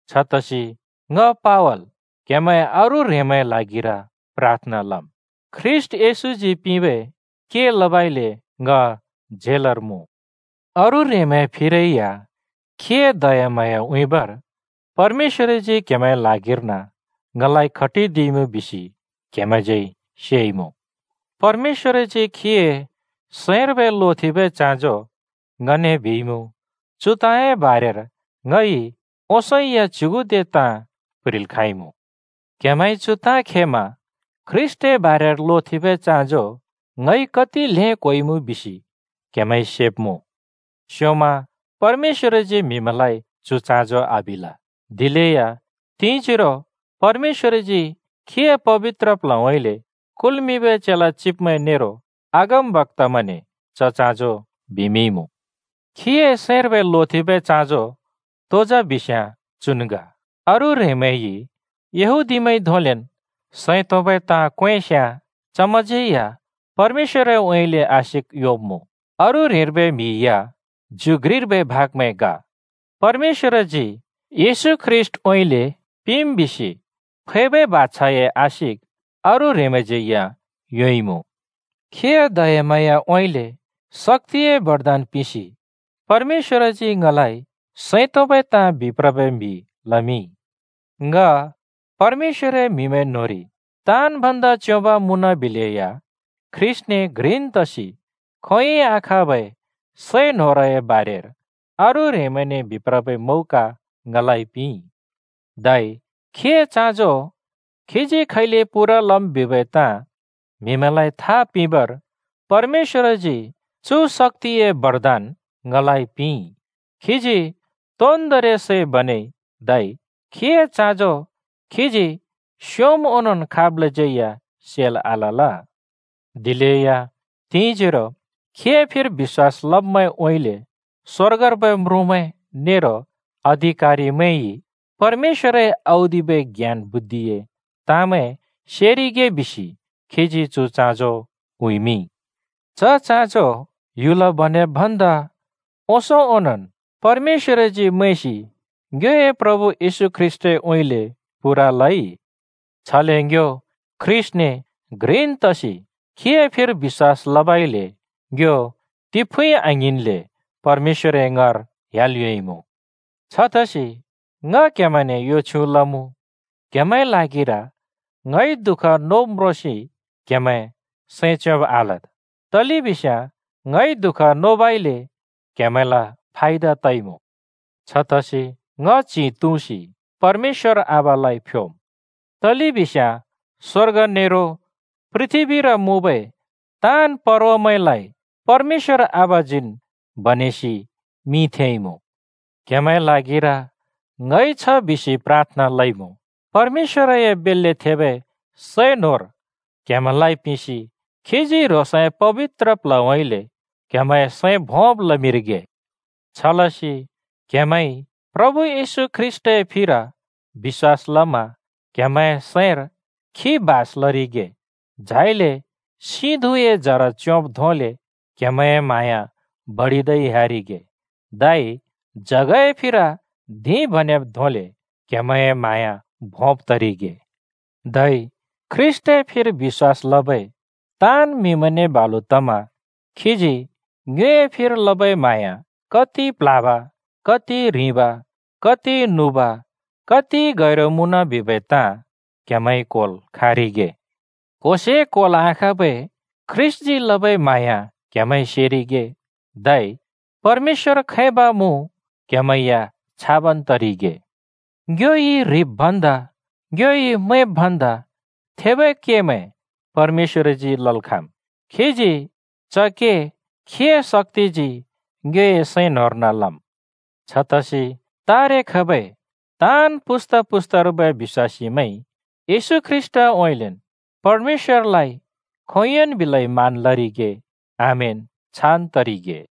छतसि ङ पावल क्हेमैं अरू ह्रेंमैंए ल्हागिर प्राथना लम्। ख्रीष्‍ट येशूजी पिंबै के लबइले ङ झेलर मुँ। अरू ह्रेंमैंए फिरै या खीए दयाम्हाँया उँइँबर परमेश्‍वरजी क्‍हेमैंए ल्हागिर्न ङलाइ खटिदिइमुँ बिसि क्‍हेमैंज्यै सेइमुँ। परमेश्‍वरजी खीए सैंर्बै लोथेंबै चाँजो ङने बिइमुँ। चु ताँए बारेर ङइ ओंसों या च्युगुदे ताँ प्‍ह्रिल् खाँइमुँ। क्हेमैंइ चु ताँ खेमा ख्रीष्‍टए बारेर लोथेंबै चाँजो ङइ कति ल्हें क्होइमुँ बिसि क्‍हेमैंइ सेब्‍मुँ। स्‍योंमन् परमेश्‍वरजी म्हिमैंलाइ चु चाँजो आबिल, दिलेया तिंजोरो परमेश्‍वरजी खीए पबित्र प्ल्हउँइँले कुल्मिंबै चेला चिब्मैं नेरो अगमबक्‍तामैंने च चाँजो बिमिंइमुँ। खीए सैंर्बै लोथेंबै चाँजो तो जा बिस्‍याँ चुन् ग: अरू ह्रेंमैंइ यहूदीमैंइ धोंलेन् सैं तोंबै ताँ क्‍वेंस्‍याँ चमैंज्यै या परमेश्‍वरउँइँले आशिक योंब्‍मुँ। अरू ह्रेंर्बै म्हि या ज्यु घ्रिर्बै भागमैं ग। परमेश्‍वरजी येशू ख्रीष्‍टउँइँले पिंम् बिसि फैबै बाछाए आशिक अरू ह्रेंमैंज्यै या योंइमुँ। खीए दयाम्हाँयाउँइँले शक्‍तिए बरदान पिंसि परमेश्‍वरजी ङलाइ सैं तोंबै ताँ बिप्रबै म्‍हि लमिंइ। ङ परमेश्‍वरए म्‍हिमैं न्‍होंरि ताँन् भन्दा च्‍योंब मुँनबिलेया ख्रीष्‍टने घ्रिन् तसि खोंयोंइ आखाँबै सै न्होरए बारेर अरू ह्रेंमैंने बिप्रबै मौका ङलाइ पिंइ। धै खीए चाँजो खीजी खैले पूरा लम् बिबै ताँ म्‍हिमैंलाइ था पिंबर परमेश्‍वरजी चु शक्‍तिए बरदान ङलाइ पिंइ। खीजी तोन्दोंरि सै बनेइ, धै खीए चाँजो खीजी स्योंम् ओंनोंन् खाबलाज्यै या सेल् आलल। दिलेया तिंजोरो खीए फिर बिश्‍वास लब्मैंउँइँले स्‍वर्गर्बै म्रुँमैं नेरो अधिकारिमैंइ परमेश्‍वरए औदिबै ज्ञान बुद्धिए ताँमै सेरिगे बिसि खीजी चु चाँजो उँइँमिंइ। च चाँजो ह्‍युल बनेब् भन्दा ओंसों ओंनोंन् परमेश्‍वरजी मैंसि ङ्योए प्रभु येशू ख्रीष्‍टउँइँले पूरा लइ। छले ङ्यो ख्रीष्‍टने घ्रिन् तसि खीए फिर बिश्‍वास लबइले ङ्यो तिफुँइ आङ्हिंन्‍ले परमेश्‍वर ङाँर ह्‍याल् योंइमुँ। छतसि ङ क्‍हेमैंने यो छ्युँ लमुँ, क्हेमैंए ल्हागिर ङइ दुःख नोब् म्रोंसि क्‍हेमैं सैं च्योंब् आलद्, तलेबिस्याँ ङइ दुःख नोबइले क्‍हेमैंल फायदा तइमुँ। छतसि ङ च्हि तुँसि परमेश्‍वर आबालाइ फ्योम्। तलेबिस्याँ स्वर्ग नेरो पृथ्‍बीर मुँबै ताँन् परवामैंलाइ परमेश्‍वर आबाजीन् बनेसि मिं थेंइमुँ। क्हेमैंए ल्हागिर ङइ छ बिसि प्राथना लइमुँ: परमेश्‍वरए बेल्‍ले थेबै सै न्होर क्हेमैंलाइ पिंसि खीजी ह्रोंसए पबित्र प्ल्हउँइँले क्‍हेमैंए सैं भोंब् लमिंरिगे। छलसि क्‍हेमैंइ प्रभु येशू ख्रीष्‍टए फिर बिश्‍वास लमा क्‍हेमैंए सैंर खी बास लरिगे। झाइले सिं धुँए जर च्योंब् धोंले क्हेमैंए म्हाँया बडिदै ह्‍यारिगे, धै जगए फिर धिं बनेब् धोंले क्हेमैंए म्हाँया भोंब् तरिगे। धै ख्रीष्‍टए फिर बिश्‍वास लबै ताँन् म्हिमैंने बालुन् तमा खीजी ङ्योए फिर लबै म्हाँया कति प्ल्हाब, कति ह्रिंब, कति नुब, कति गैरु मुँन बिबै ताँ क्हेमैंइ क्होल् खाँरिगे। क्होसे क्होल् आखाँबै ख्रीष्‍टजी लबै म्हाँया क्हेमैंइ सेरिगे, धै परमेश्‍वर खैब मुँ क्हेमैं या छाबन् तरिगे। ङ्योइ ह्रिब् भन्दा, ङ्योइ मैंब् भन्दा थेबै केमैं परमेश्‍वरजी लल् खाँम्। खीजी च के खीए शक्‍तिजी ङ्योए सैं न्‍होंर्न लम्। छतसि तारे खबै ताँन् पुस्‍ता-पुस्तार्बै बिश्‍वासीमैंइ येशू ख्रीष्‍टउँइँलेन् परमेश्‍वरलाइ खोंयोंन् बिलै मान लरिगे। आमेन, छान् तरिगे!